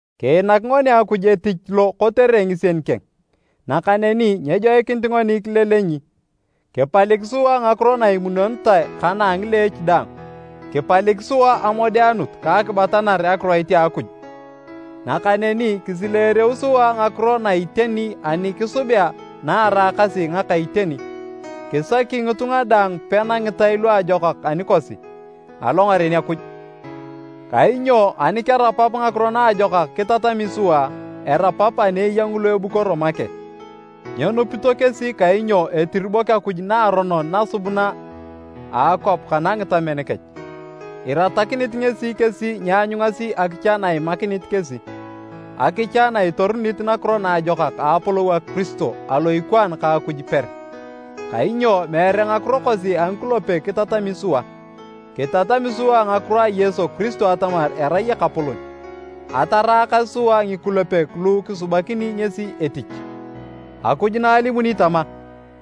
Kiinak ngoni Akuj etich lo kotere ngisien keng, nakaneni nyejoikinit ngoni kilelenyi. Kipalik sua ngakiro na imunonitae kana a ngileech daang. Kipalik sua amodeanut ka akibatanar Akiroit a Akuj, nakaneni kisileereu sua ngakiro na a iteni ani kisubea naeraakasi ngaka iteni. Kisaki ngitunga daang pena ngitai luajokak anikosi, alongaren Akuj. Kainyo ani kerapap ngakiro naajokak kitatami sua, erapap ani eya ngulu ebukoro make. Nyenupito kesi kainyo etiribok akuj naaronon nasubuna a akwap kana ngitamen kech. Iratakinit ngesi kesi nyeanyungasi akicha na imakinit kesi, akicha na itorunit Nakiro Naajokak a apolou a Kiristo, alo ikwaan ka Akuj per. Kainyo meere ngakiro kosi a ngikulepek kitatami sua, kitatami sua ngakiro a Yesu Kiristo atamar erai Ekapolon. Ataraakas sua ngikulepek lu kisubanakini ngesi etich. Akuj na alimuni tama,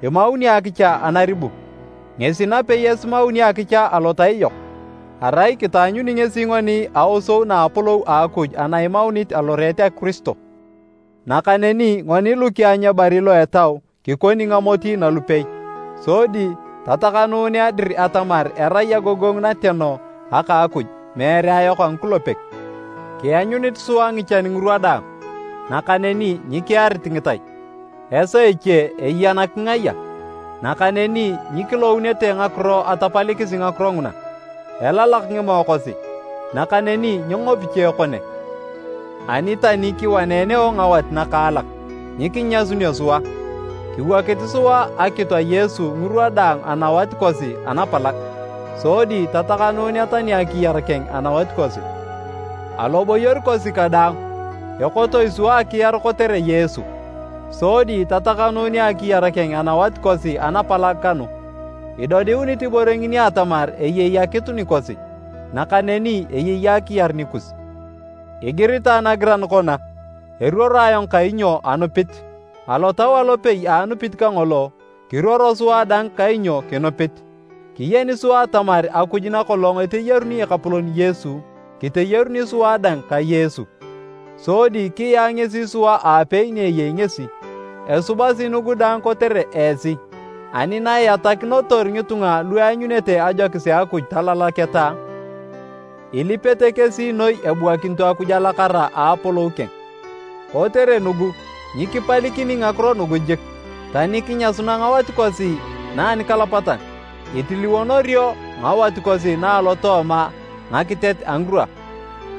“Imauni akicha anaribu,” ngesi napei esimauni akicha alotai yok. Arai kitaanyuni ngesi ngoni aosou na a apolou a Akuj na imaunit aloreet a Kiristo. Nakaneni ngoni lu kianyu ebari lo etau, kikoni ngamoti nalupei. Sodi tatakanunea dir atamar erai agogongu nateno aka a Akuj, meere ayok a ngikulepek. Kianyunit sua ngichan ngirwa daang, nakaneni nyikiarit ngitai. Esaa eche eya nakingaya, nakaneni nyikilounete ngakiro atapalikisi ngakiro nguna, elalak ngimoe kosi, nakaneni nyengopi cha ekone, ani tani kiwaneneo ngawanet nakaalak, nyikinyasunio sua. Kiwokit sua akitu a Yesu ngirwa daang anawat kosi anapalag, sodi tatakanunea tani akiyar keng anawat kosi. Aloboyor kosi kadaang, ekotoi sua akiar kotere Yesu, sodi tatakanunea akiyar keng anawat kosi anapalag kanu. Idodiunit ibore ngini atamar eyei akitu nikosi, nakaneni eyei akiyar nikus. Igiritae nagiran kona, “Eruoro ayong kainyo anupit.” Alotau alopei a anupit kangolo, kiruoro sua dang kainyo kinupit. Kiyeni sua atamar Akuj nakolong eteyaruni Ekapolon Yesu, kiteyaruni sua dang ka Yesu, sodi kiyaa ngesi sua aapei ni eyei ngesi. Esubasi nugu daang kotere esi, ani na iatakinotor ngitunga lu eanyunete ajokis a Akuj talalaketa, ilipete kesi noi ebuakinito Akuj alakara a apolou keng. Kotere nugu, nyikipalikini ngakiro nugu jik. Tani kinyasuna ngawat kosi na anikalapatan, itiliwonorio ngawat kosi na alotooma ngakitet a ngirwa.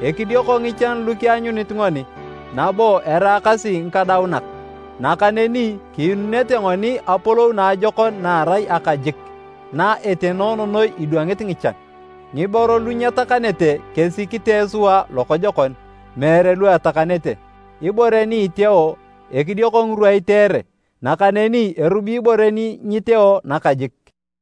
Ekidioko ngichan lu kianyunit ngoni, nabo eraakasi ngikadaunak, nakaneni kiinunete ngoni apolou naajokon na erai aka jik, na etenoono noi idwangit ngichan. Ngiboro lu nyetakanete kesi kitee sua lokojokon, meere lu etakanete. Ibore ni iteeo, ekidioko ngirwa iteere, nakaneni erubi ibore ni nyiteeo nakajik.